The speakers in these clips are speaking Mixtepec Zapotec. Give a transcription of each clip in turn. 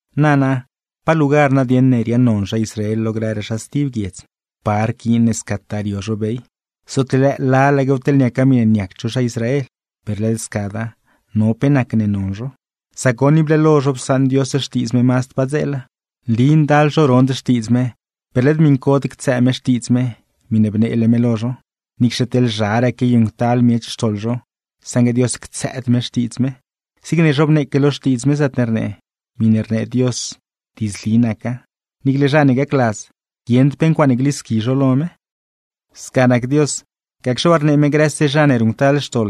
Nana, ¿pa lugar nadieṉ ne riaaṉnon zha Israel lo grëraa zha stib guiedz? ¿Pa rquiin ne scataa rio zho bey? Zootle lëë lalaquew teḻ niaca miṉe niacd zho zha Israel. Per led scada, no pe nacne non zho. Sac goṉ, ible lo zho psaṉ Dios xtiidz me mazd padzeela. Nli ndal zho rond xtiidz me, per led miṉcod ctsëë me xtiidz me, miṉe bneele me lo zho. Niicxe teḻ zharaa quiayuṉctal miech xtoḻ zho, saṉgue Dios ctsëëd me xtiidz me. Zigne zhobneeque lo Xtiidz me, zaatne rnee: “Miṉe rnee Dios, diidzli naca; niicle zha ne gacladz, guieṉd pe ncuaaṉe glisqui zho lo me.” Sca nac Dios, gacxe waa rnee me grëse zha ne ruṉctal xtoḻ,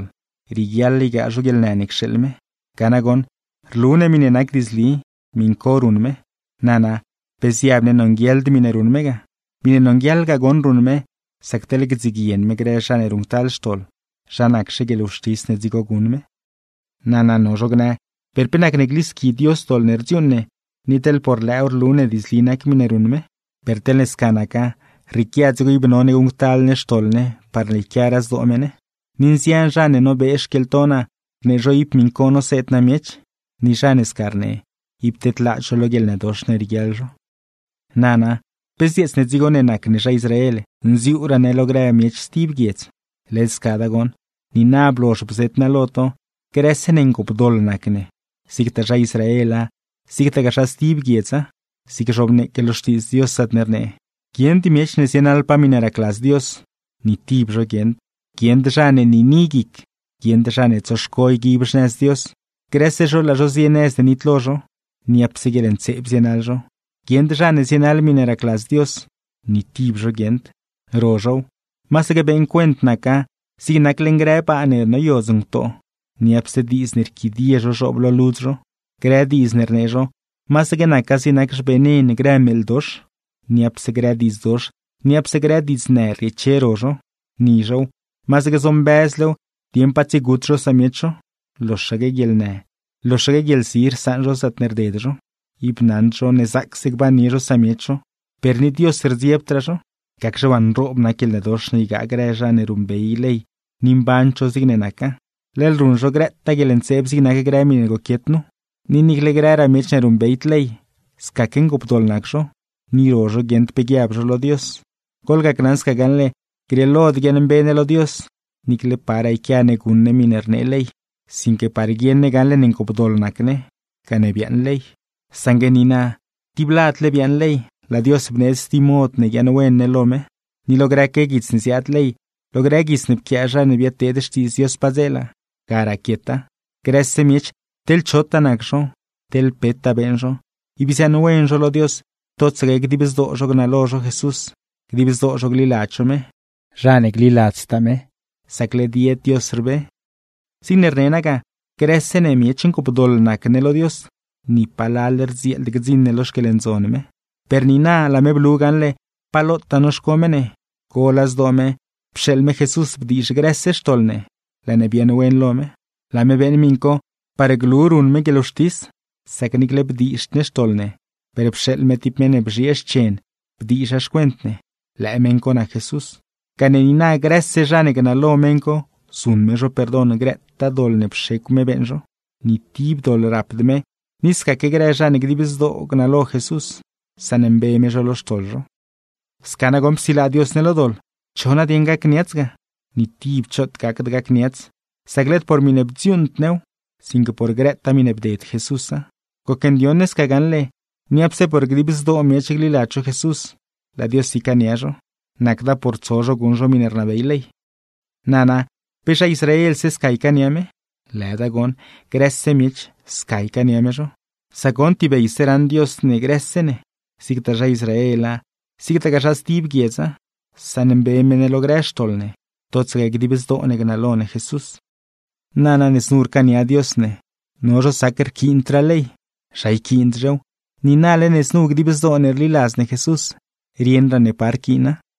rieguiaḻ ygaa zho guieḻnë ne cxeeḻ me. Ga nagoṉ, rlu ne miṉe nac diidzli, miṉ co ruṉ me. Nana, ¿pe ziab ne nonguieḻd miṉe ruṉ me ga? Miṉe nonguieḻ ga goṉ ruṉ me, sac teḻ gdziguien me grë zha ne ruṉctal xtoḻ, ¿zha naczhe guieḻwxtis ne dzigo guṉ me? Nana, nogaa zho gnë, ¿per pe nacne glisqui Dios doḻ ne rdziuuṉ ne, ni teḻ por lëëw rlu ne diidzli nac miṉe ruṉ me? Per teḻne sca naca, rrieequia dzigo ib none guṉctal ne xtoḻ ne parne yquiaraa zdoo me ne. Ni nzian zha ne nobee xquieḻto naa, rnee zho ib miṉ co noseed naa miech. Ni zha ne sca rnee, ib tedlaad zho lo guieḻnëdox ne rieguiaḻ zho. Nana, ¿pe zdzieets ne dzigo ne nac ne zha Israel, nziuuraa ne lo grëraa miech stib guiedz? ¡Led scada goṉ! Niina blozh bzeet naa lo to, grëse ne ngoopdoḻ nac ne, zigtaa zha Israela, zigtagaa zha stib guiedza. Zigne zhobneeque lo Xtiidz Dios, zaatne rnee: ¡Guieṉd miech ne zienaḻpaa miṉe racladz Dios! ¡Ni tib zho guieṉd! Guieṉd zha ne niini guic; guieṉd zha ne tsoxco yguib xnëz Dios. Grëse zho laa zho zie nëz ne nitlo zho; niapse guieḻntseeb zienaḻ zho. ¡Guieṉd zha ne zienaḻ miṉe racladz Dios! ¡Ni tib zho guieṉd! Ro zhow, masaque beeṉ cuent naca zig nac leṉ grë baa ne noyodz ngutoo; niapse diidz ne rquidie zho zhoob lo ludz zho. Grë diidz ne rnee zho, masaque naca zig nac xvenen grë meeḻ dox; niapse grë diidz dox, niapse grë diidznë rrieeche ro zho. Ni zhow, masaque zombëzlew dieṉ pa tsiegut zho samiech zho; loxaque guieḻnë, loxaque guieḻzi rsaṉ zho zaatne rded zho. Ib naṉd zho ne zaacse gbannie zho samiech zho; per ni Dios rdziebdraa zho. Gacxe waa nroob nac guieḻnëdox ne ygaa grë zha ne ruṉbey ley ni mband zho zigne naca, leḻ ruṉ zho grëtaa guieḻntseeb zig nac grë miṉe goquiet nu. Ni niicle grëraa miech ne ruṉbeyd ley, scaque ngoopdoḻ nac zho, ni ro zho guieṉd pe guiab zho lo Dios. Goḻgaṉ sca gaṉle, grieelod guiaaṉmbe ne lo Dios, niicle paraa yquia ne guṉ ne miṉe rnee ley; sinque par guieṉ ne gaṉle ne ngoopdoḻ nac ne, gane biaaṉ ley. Saṉgue niina, tib ladle biaaṉ ley, laa Dios bneedz stib mod ne guiaaṉwen ne lo me. Ni lo grëque guits ne ziaad ley, lo grë guits ne pquiaa zha ne biadteed Xtiidz Dios padzeela, ga raquieta. Grëse miech teḻ chotaa nac zho, teḻ petaa beeṉ zho, ib ziaaṉwen zho lo Dios totsaque dib zdoo zho gnalo zho Jesús, dib zdoo zho gliladz zho me. Zha ne gliladztaa me, sac led yed Dios rbe. Zigne rne naa ga, grëse ne miech ngoopdoḻ nac ne lo Dios, ni palal rdzieeld gdziṉ ne lo xquieḻndzon me. Per niina laa me blu gaṉle pa lotaa noxco me ne, gola zdoo me pxeeḻ me Jesús bdiizh grëse xtoḻ ne, laa ne biaaṉwen lo me. Laa me beeṉ miṉ co parne glu ruṉ me guieḻwxtis, sac niicle bdizhd ne xtoḻ ne, per pxeeḻ me tib meṉ ne bzhiee xchen bdiizha xcuent ne, lëë meṉ co nac Jesús; gane niina grëse zha ne gnalo meṉ co, zuṉ me zho perdon grëtaa doḻ ne pxecw me beeṉ zho. Ni tib doḻ rapd me, ni scaque grë zha ne dib zdoo gnalo Jesús, saṉmbe me zho lo xtoḻ zho. Sca nagoṉ psilaa Dios ne lo doḻ. ¿Cho nadieṉ gacniats ga? Ni tib choot gacd gacniats, sac led por miṉe bdziuuṉd new, sinque por grëtaa miṉe bded Jesúsa. Gocndioṉ ne sca gaṉle: Niapse por dib zdoo miech gliladz zho Jesús, laa Dios ycaania zho; nacda por tso zho guṉ zho miṉe rnabey ley. Nana, ¿pe zha Israelse sca ycaania me? ¡Lëda goṉ! Grëse miech, sca ycaania me zho. Sac goṉ tibeyse raṉ Dios ne grëse ne; zigtaa zha Israela, zigtagaa zha stib guiedza, saṉmbe me ne lo grë xtoḻ ne, totsaque dib zdoo ne gnalo ne Jesús. Nana, ne znu rcaania Dios ne, no zho sac rquiindraa ley. ¿Zha yquiind-zhew? Niinale ne znu dib zdoo ne rliladz ne Jesús, rieṉraa ne pa rquiina.